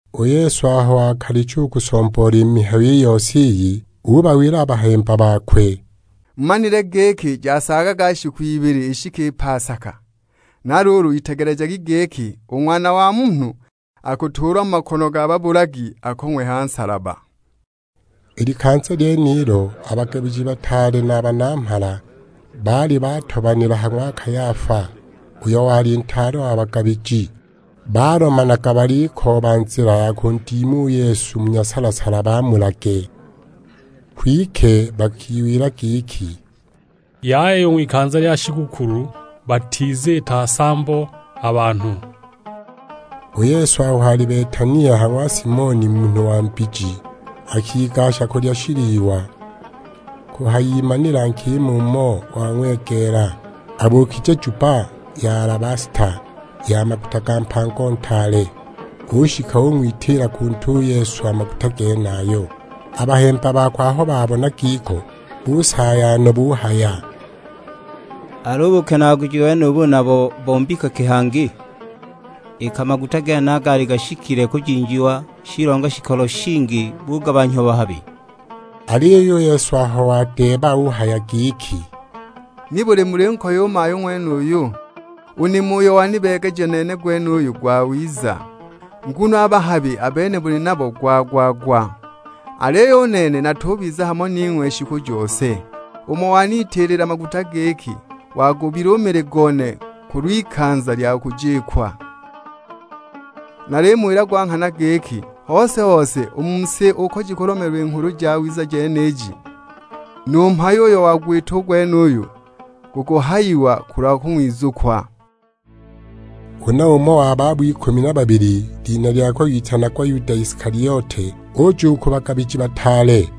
U Yesu aho wakalicha u kusomboola i mihayo i yose iyi, ubawila a bahemba bakwe, "Mumanile giki jasaagaga shiku ibili ishike pasaka; na luulu itegelejagi giki, u Ng'wana wa Munhu akutuulwa mu makono ga babulagi akong'we ha nsalaba." I likanza lyenilo a bagabiji bataale na a banamhala baali batobanila ha ng'wa Kayafa, uyo wali ntaale wa bagabiji. Balomanaga balikooba nzila ya kundima u Yesu mu nyasala-sala bamulage. Kwike bakiwila giki, "Yaya u ng'wikanza lya shigukulu, batiziita nsambo a banhu." U Yesu aho ali Betania, ha ng'wa Simoni munhu wa mbiji, akigasha kulya shiliwa. Kuhayimanila nkima umo wang'wegeela, abuukije jubba ya alabasta, ya maguta ga mpango ntaale; ushika ung'witiila ku ntwe u Yesu a maguta genayo. A bahemba bakwe aho babona giko busaaya no; buhaya, "Al'u bukenaaguji ubu nabo bo mbika ki hangi? Iki a maguta genaya gaali gashikile kujinjiwa, shilonga shikolo shingi bugabanhyiwa bahabi!" Aliyo u Yesu aho wadeeba uhaya giki, "Nibuli mulinkoya u mayu ng'wenuyu? U nimo uyo wanibeegeja nene gwenuyu gwawiza. Nguno a bahabi a bene muli nabo gwa-gwa-gwa, aliyo u nene natubiza hamo ning'we shiku jose. Umo wanitiilila maguta giki, wagubila u mili gone kulw'ikanza lya kujikwa. Nalimuwila gwa nghana giki, hose-hose u mu si uko jikulomeelwa i Nghulu Jawiza jeniji, nu mhayo uyo wagwita gwenuyu gukuhayiwa kulwa kung'wizukwa." Huna umo wa babo ikumi na babili, lina lyakwe witanagwa Yuda Isikaliote, uja u ku bagabiji bataale.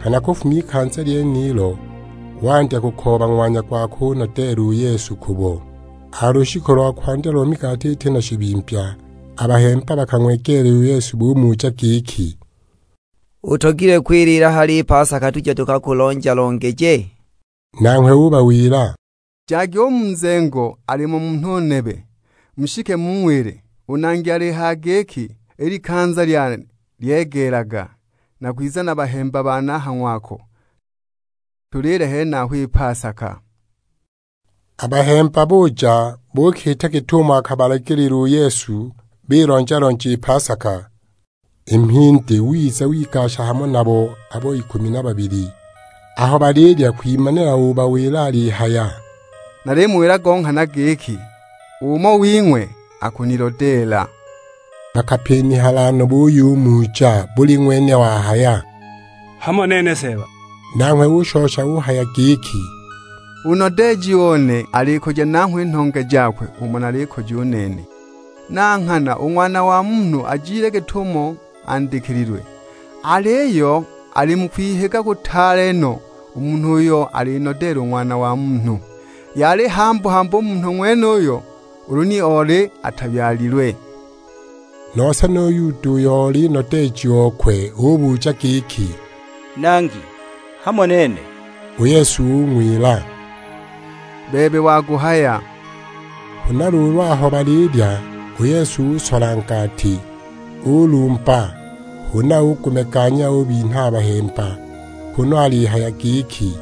Nghana kufuma ikanza lyenilo wandya kukooba ng'wanya gwa kunodeela u Yesu kubo! A ha lushiku lo kwandya lo migati iti na shibimbya, a bahemba bakang'wegeela u Yesu bumuja giki, "Utogilwe kwiliila hali i pasaka tuje tukakulonja-longeje?" Nanghwe ubawila, "Jagi u mu nzengo, alimo munhu nebe; mushike mung'wile, 'U Nangi alihaya giki: I likanza lyane lyegeelaga, nakwiza na a bahemba bane a ha ng'wako, tuliile henaho i pasaka.' " A bahemba buja buukiita git'umo akabalagiilila u Yesu; bilonja-lonja i pasaka. I mhindi wiza wigasha hamo nabo abo ikumi na babili. Aho balilya kwimanila obawila alihaya, "Nalimuwila go nghana giki, umo wing'we akunilodeela!" Bakapinihala no buyumuja; buli ng'wene wahaya, "Hamo nene Seeba?" Nanghwe ushosha uhaya giki, "U nodeeji one alikoja nanghwe i nhonge jakwe umo nalikoja u nene! Na nghana u Ng'wana wa Munhu ajile git'umo andikililwe, aliyo ali mu kwihiga kutaale no u munhu uyo alinodeela u Ng'wana wa Munhu. Yali hambu-hambu u munhu ng'wenuyo ulu ni oli atabyalilwe!" Nose nu Yuda, uyo oli nodeeji okwe, ubuja giki; "Nangi, hamo nene?" U Yesu ung'wila, "Bebe waguhaya!" Huna luulu aho balilya, u Yesu usola ngati. Ulumba huna ugumeganya, ubinha a bahemba kunu alihaya giki,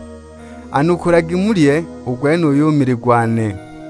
"Anukulagi mulye; u gwenuyu mili gwane."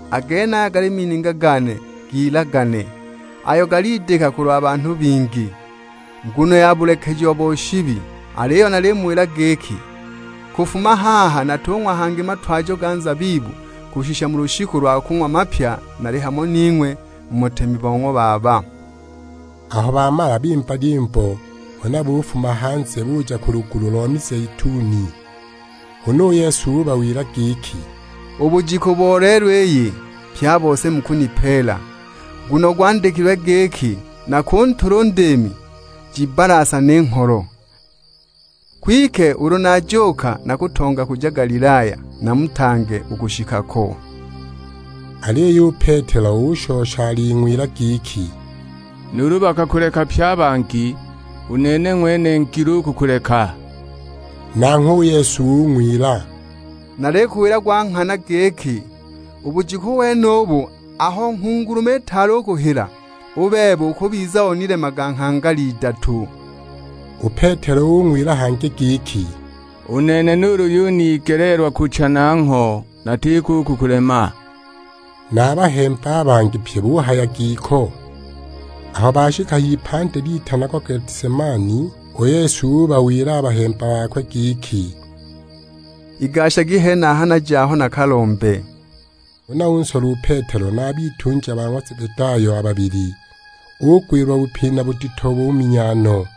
A genaya gali mininga gane g'ilagane, ayo galidika kulwa banhu bingi, nguno ya bulekejiwa bo shibi. Aliyo nalimuwila giki, kufuma haha natung'wa hangi matwajo ga nzabibu kushisha mu lushiku lwa kung'wa mapya nali hamo ning'we mu butemi bo ng'wa Baba." Aho bamala bimba lyimbo, huna bufuma hanze buja ku lugulu lo mizeituni. Huna u Yesu ubawila giki, "U bujiku bo lelo iyi, pye a bose mukunipeela; nguno gwandikilwe giki, 'Nakuntula u ndiimi, jibbalasane i ngholo.' Kwike ulu najuuka nakutonga kuja Galilaya, namutange u kushika ko." Aliyo u Petelo ushosha aling'wila giki, "Nuulu bakakuleka pye a bangi, u nene ng'wene ngilo u kukuleka." Nanghwe u Yesu ung'wila, "Nalikuwila gwa nghana giki, u bujiku wenubu aho nghungulume itaali kuhila, u bebe ukubiza onilemaga nghangala idatu!" U Petelo ung'wila hangi giki, "U nene nuulu yunigeleelwa kucha nangho, natiko u kukulema!" Na a bahemba a bangi pye buhaya giko. Aho bashika h'ipandi litanagwa Getisemani, u Yesu ubawila a bahemba bakwe giki, "Igashagi henaha naje aho nakalombe." Huna unsola u Petelo na a bitunja ba ng'wa Zebedayo a babili; ugwilwa bupina budito buminya no.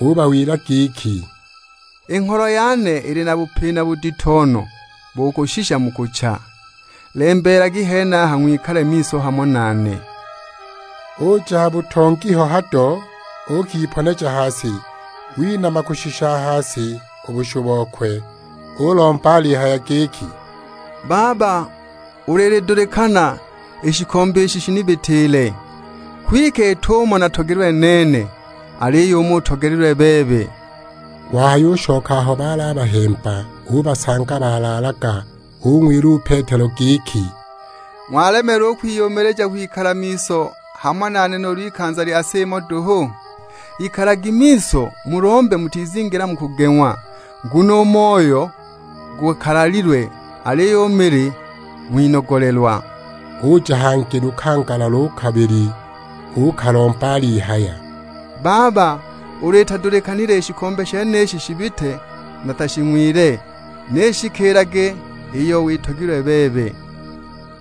Ubawila giki, "I ngholo yane ili na bupina budito no, bo kushisha mu kucha. Lembeelagi henaha ng'wikale miso hamo nane." Uja ha butongi ho hado, uukiponeja ha si, winama kushisha ha si u bushu bokwe, ulomba alihaya giki, "Baba ulu ilidulikana, i shikombe ishi shinibitiile; kwike it'umo natogelilwe nene, aliyo umo utogelilwe bebe!" Wahayushoka aho baali a bahemba, ubasanga balaalaga, ung'wila u Petelo giki, "Ng'walemeelwa u kwiyumilija kwikala miso hamo nane nuulu ikanza lya sa imo duhu? Ikalagi miso mulombe mutizingila mu kugeng'wa; nguno u moyo gukalalilwe, aliyo u mili ng'winogolelwa!" Uja hangi lukangala lo kabili uukalomba alihaya, "Baba, ulu itadulikanile i shikombe shenishi shibite natashing'wile, ni ishikiilage iyo witogilwe bebe!"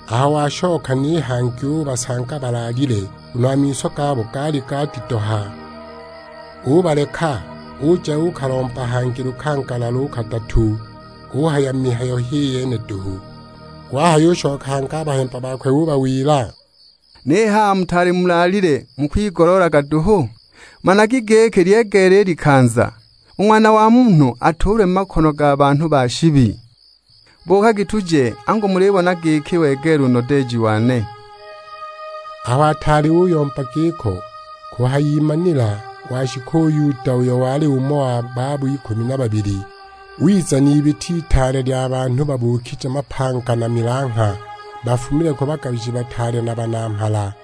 Aho washoka ni hangi ubasanga balaalile, nguno a miso gabo gaali gadidoha. Ubaleka, uja uukalomba hangi lukangala lo kadatu, uhaya mihayo h'i yene duhu. Wahayushoka hangi a ha bahemba ubawila, "Ni haha mutaali mulaalile mukwigoloolaga duhu? Managi giki lyegeela i likanza, u Ng'wana wa Munhu atuulwe mu makono ga banhu ba shibi. Buukagi tuje, angu mulibona giki wegeela u nodeeji wane!" Aho ataali uyomba giko, kuhayimanila washika u Yuda, uyo wali umo wa babo ikumi na babili. Wiza n'ibita itaale lya banhu babuukije mapanga na milangha, bafumile ku bagabiji bataale na banamhala.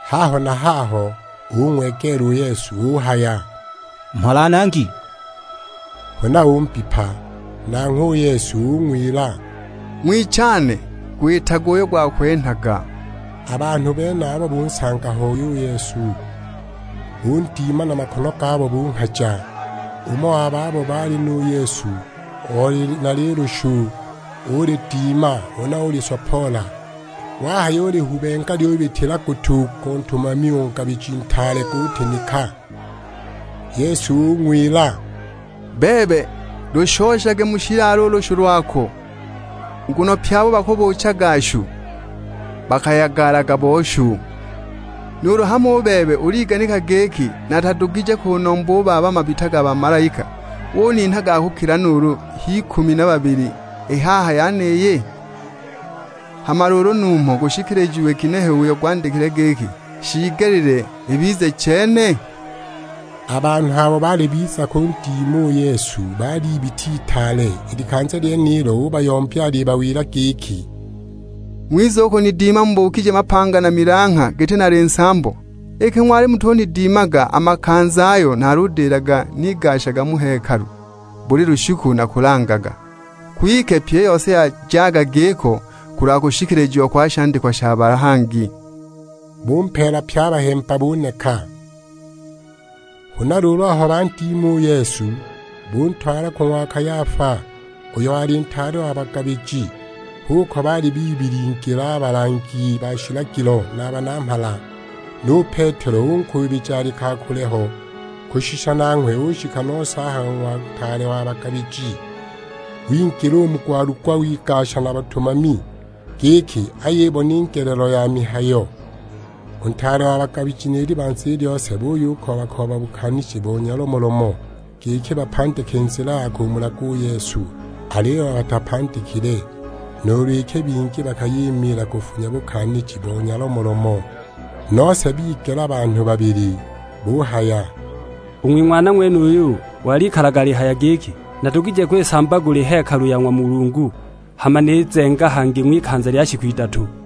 Haho na haho ung'wegeela u Yesu; uhaya, "Mhola Nangi!" Huna umbipa. Nanghwe u Yesu ung'wila, "Ng'wichane, gwitage uyo gwakwenhaga!" A banhu benabo bunsanga hoi u Yesu, bundima na makono gabo bunghaja. Umo wa babo baali nu Yesu oli na lilushu, ulidima, huna ulisopoola; wahayulihubenga lyubitila gutu go ntumami o ngabiji ntaale, gutinika! U Yesu ung'wila, "Bebe, lushoshage mu shilalo u lushu lwako, nguno pye abo bakabuuchaga shu bakayagalaga bo shu. Nuulu hamo u bebe uliganika giki natadugije kunomba u Baba mabita ga bamalaika uninha ga kukila nuulu h'ikumi na abili i haha yeniyi? Hama luulu numho gukushikilijiwa ginehe uyo gwandikilwe giki, 'Shiigelile ibize chene?' " A banhu abo baali biza kundima u Yesu baali ibita itaale; i likanza lyenilo ubayombya alibawila giki, "Ng'wiza u kunidima mubukije mapanga na milangha giti nali nsambo? Iki ng'wali mutunidimaga a makanza ayo naludilaga nigashaga mu hekalu buli lushiku nakulangaga! Kwike pyi i yose yajaga giko kulwa kushikilijiwa kwa shandikwa sha bahangi." Bumpeela pye a bahemba, buneka! Huna luulu aho bandima u Yesu, buntwala ku ng'wa Kayafa, uyo wali ntaale wa bagabiji; h'uko baali bibilingila a balangi ba shilagilo na a banamhala. Nu Petelo unkuubija ali ka kule ho, kushisha nanghwe ushika nose a ha ng'wa ntaale wa bagabiji. Wingila u mu gwalugwa, wigasha na batumami, giki ayibone i ngelelo ya mihayo. U ntaale wa bagabiji ni libanza i lyose buyukooba-kooba bukaaniji bo nyalomolomo, giki bapandike nzila ya kumulaga u Yesu. Aliyo batapandikile, nuulu iki bingi bakayimiila kufunya bukaaniji bo nyalomolomo. Nose bigela banhu babili; buhaya, "U ng'wing'wana ng'wenuyu walikalaga uhaya giki, 'Nadugije kwisambagula i hekalu ya ng'wa Mulungu, hama nizenga hangi ng'wikanza lya shiku idatu!' "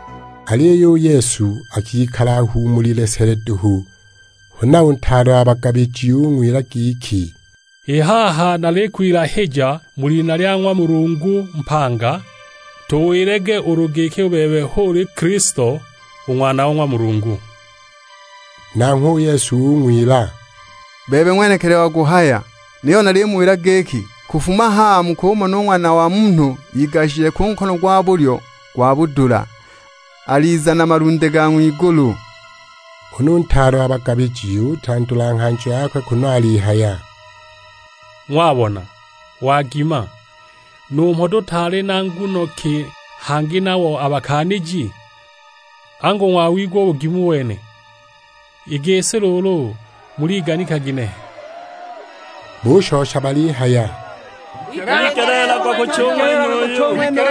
Aliyo u Yesu akikala ahuumulile sele duhu. Huna u ntaale wa bagabiji ung'wila giki, "I haha nalikwilahija mu lina lya ng'wa Mulungu mpanga, tuwilage ulu giki u bebe hu uli Kilisto, u Ng'wana wa ng'wa Mulungu!" Nanghwe u Yesu ung'wila, "Bebe ng'wenekili waguhaya, niyo nalimuwila giki, kufuma haha mukumona u Ng'wana wa Munhu igashije ku nkono gwa bulyo gwa budula, aliza na malunde ga ng'wigulu." Huna u ntaale wa bagabiji utandula nghanjo yakwe, kunu alihaya; "Ng'wabona, wagima! Numho tutaali na nguno ki hangi nabo a bakaaniji? Angu ng'wawigwa u bugimu wene! I gisi luulu muliganika ginehe?" Bushosha balihaya, "Wigeleelagwa kucha u ng'wenuyu!"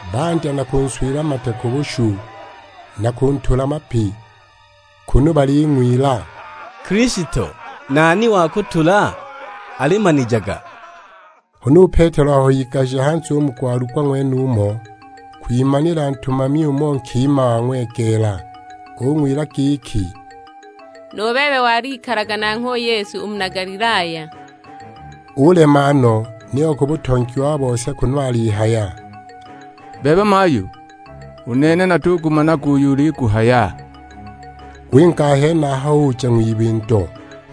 Bandya na kunswila mate ku bushu, na kuntula mapi; kunu baling'wila, "Kilisto, nani wakutula? Alimanijaga!" Huna u Petelo aho igashije hanze u mu gwalugwa ng'wenumo, kwimanila ntumami umo nkima wang'wegeela. Ung'wila giki, "Nu bebe walikalaga nanghwe u Yesu, u muna Galilaya!" Ulema no, niyo ku butongi wa bose; kunu alihaya, "Bebe mayu, u nene natugumanaga uyo uliguhaya!" Winga a henaho uja ng'wibindo;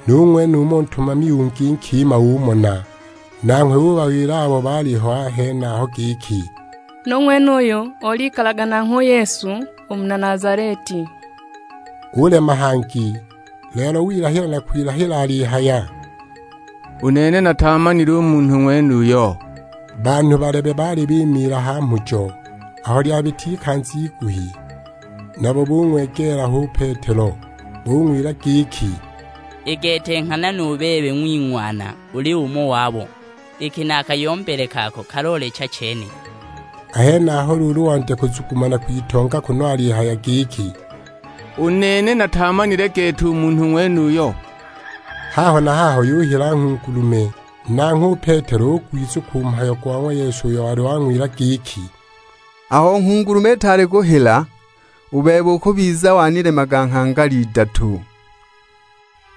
nu ng'wenumo ntumami ungi nkima umona. Nanghwe ubawila abo baaliho a henaho giki, "Nu ng'wenuyu olikalaga nanghwe u Yesu u muna Nazaleti!" Ulema hangi; lelo wilahila na kwilahila alihaya, "U nene nataamanile u munhu ng'wenuyo!" Banhu balebe baali bimiila ha mhujo. Aho lyabita ikanza iguhi, nabo bung'wegeela ho u Petelo; bung'wila giki, "I gete nghana nu bebe ng'wing'wana uli umo wabo, iki na a kayombele kako kaloolecha chene!" A henaho luulu wandya kuzuma na kwitonga, kunu alihaya giki; "U nene nataamanile gete u munhu ng'wenuyo!" Haho na haho yuhila nghungulume! Nanghwe u Petelo ugwizukwa u mhayo go ng'wa Yesu uyo wali wang'wila giki, "Aho nghungulume itaali kuhila, u bebe ukubiza wanilemaga nghangala idatu."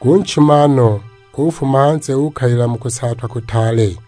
Gunchima no, ufuma hanze uukalila mu kusaatwa kutaale!